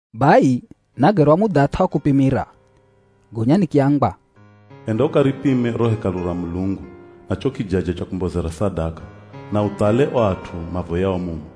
Bai nagerwa mudhath'a wa kupimira, gonya nikiambwa, “Enda ukaripime ro Hekalu ra Mulungu, na cho kijaja cha kumbozera sadaka, na uthale o at'u mavoyao mumo.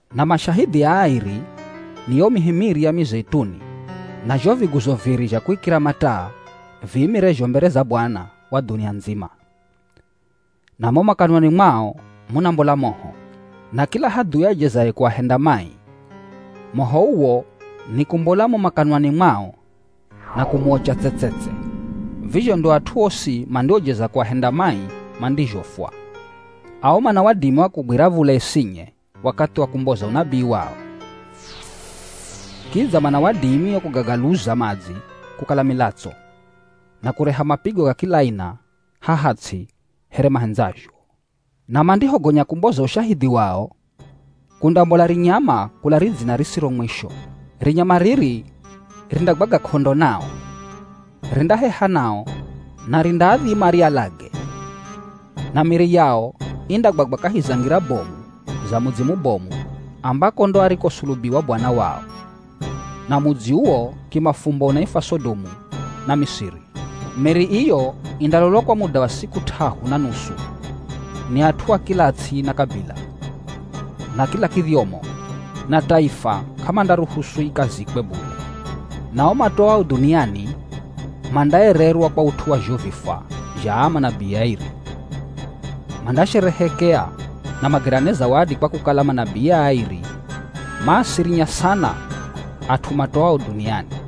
Na mashahidhi aa airi ni yo mihi miri ya mizeituni na zho viguzo viri zha kuikira mataa viimirezho mbere za Bwana wa dhunia ndzima. Na mo makanwani mwao munambola moho. Na kila hadhui ajezaye kuahenda mai, moho uwo nikumbola mo makanwani mwao na kumuocha tse-tse-tse. Vizho ndo at'u osi mandiojeza kuahenda mai mandizhofwa. Ao mana wadimi wa kugwira v̱ula isinye wakathi wa kumboza unabii wao. Kidza mana wadimi wa kugagaluza madzi kukala milatso na kureha mapigo ga kila aina haha ts'i here mahendzazho. Na mandihogonya kumboza ushahidhi wao, kundambola rinyama kula ridzina risiro mwisho. Rinyama riri rindagwaga k'ondo nao. Rindaheha nao na rindaadhima rialage. Na miri yao indagwagwa kahi za ngira bomu za mudzi mubomu ambako ndo arikosulubiwa Bwana wao. Na mudzi uwo kimafumbo unaifwa Sodomu na Misiri. Miri iyo indalolwa kwa muda wa siku t'ahu na nusu ni at'u a kila ts'i na kabila, na kila kidhyomo na taifa k'amandaruhusu ikazikwe bule. Na o matoao dhuniani mandaererwa kwa ut'u wa zho vifwa zha aa manabii airi. Mandasherehekea na magerane zawadi kwa kukala manabii aa airi maasirinya sana at'u matoao dhuniani.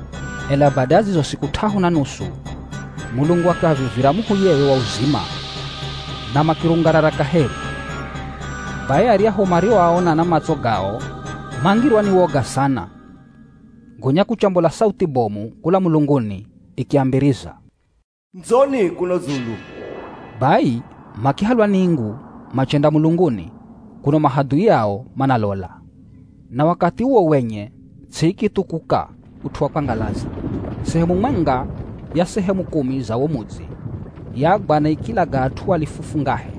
Ela bada ya zizo siku t'ahu na nusu, Mulungu akiavivira muhuyewe wa uzima na makirungarara kaheri. Bai aryahu marioaona na matso gao mangirwa ni woga sana. Gonya kuchambola sauthi bomu kula mulunguni ikiambiriza, “Ndzoni kuno dzulu!” Bai makihalwa ni ingu machenda mulunguni kuno mahadhui ao manalola. Na wakathi uwo wenye ts'i ikithukuka ut'u wa kwangalaza. Sehemu mwenga ya sehemu kumi za wo mudzi yagwa na ikilaga at'u alifu fungahe.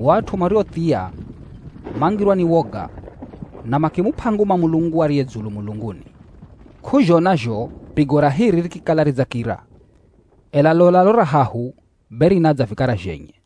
O at'u mariothia, mangirwa ni woga na makimup'a nguma Mulungu ariye dzulu mulunguni. K'uzhona zho pigo ra hiri rikikala ridzakira, ela lola ro ra hahu be rinadza vikara zhenye.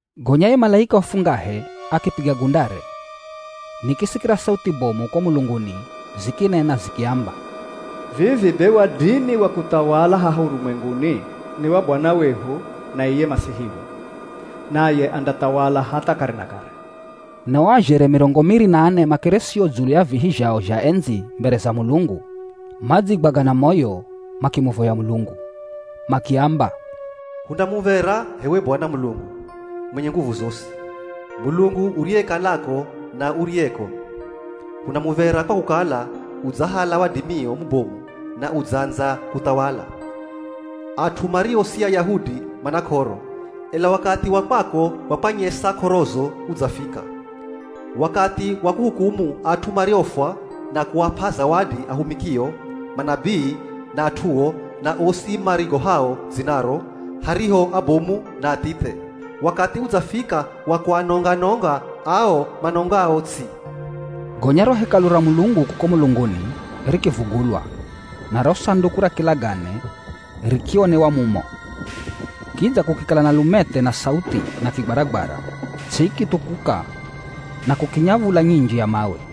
Gonya ye malaika wa fungahe akipiga gundare. Nikisikira sauthi bomu ko mulunguni zikinena zikiamba, “Vivi be wadimi wa kuthawala haha urumwenguni ni wa Bwana wehu, na iye Masihiwe. Naye andathawala hatha kare na kare.” Na o azhere mirongo miri na ane makeresio dzulu ya vihi zhao zha endzi mbere za Mulungu, madzigwaga na moyo makimuvoya Mulungu. Makiamba, “Huna muv̱era h'ewe Bwana Mulungu, mwenye nguvu zosi. Mulungu uriyekalako na uriyeko. Huna muv̱era kwa kukala udzahala wadimio mubomu na udzaandza kuthawala. At'u mario si Ayahudi mana k'oro, ela wakathi wa kwako wa kwanyesa k'orozo udzafika. Wakathi wa kuhukumu at'u mariofwa na kuap'a zawadi ahumikio, manabii na at'uo, na osi marigohao dzinaro, hariho abomu na athithe. Wakathi udzafika wa kuanonga-nonga ao manongao ts'i.” Gonya ro Hekalu ra Mulungu kuko mulunguni rikivugulwa na ro Sanduku ra Kilagane rikionewa mumo. Kidza kukikala na lumethe na sauthi na kigwaragwara. Ts'i ikithukuka na kukinya v̱ula nyinji ya mawe.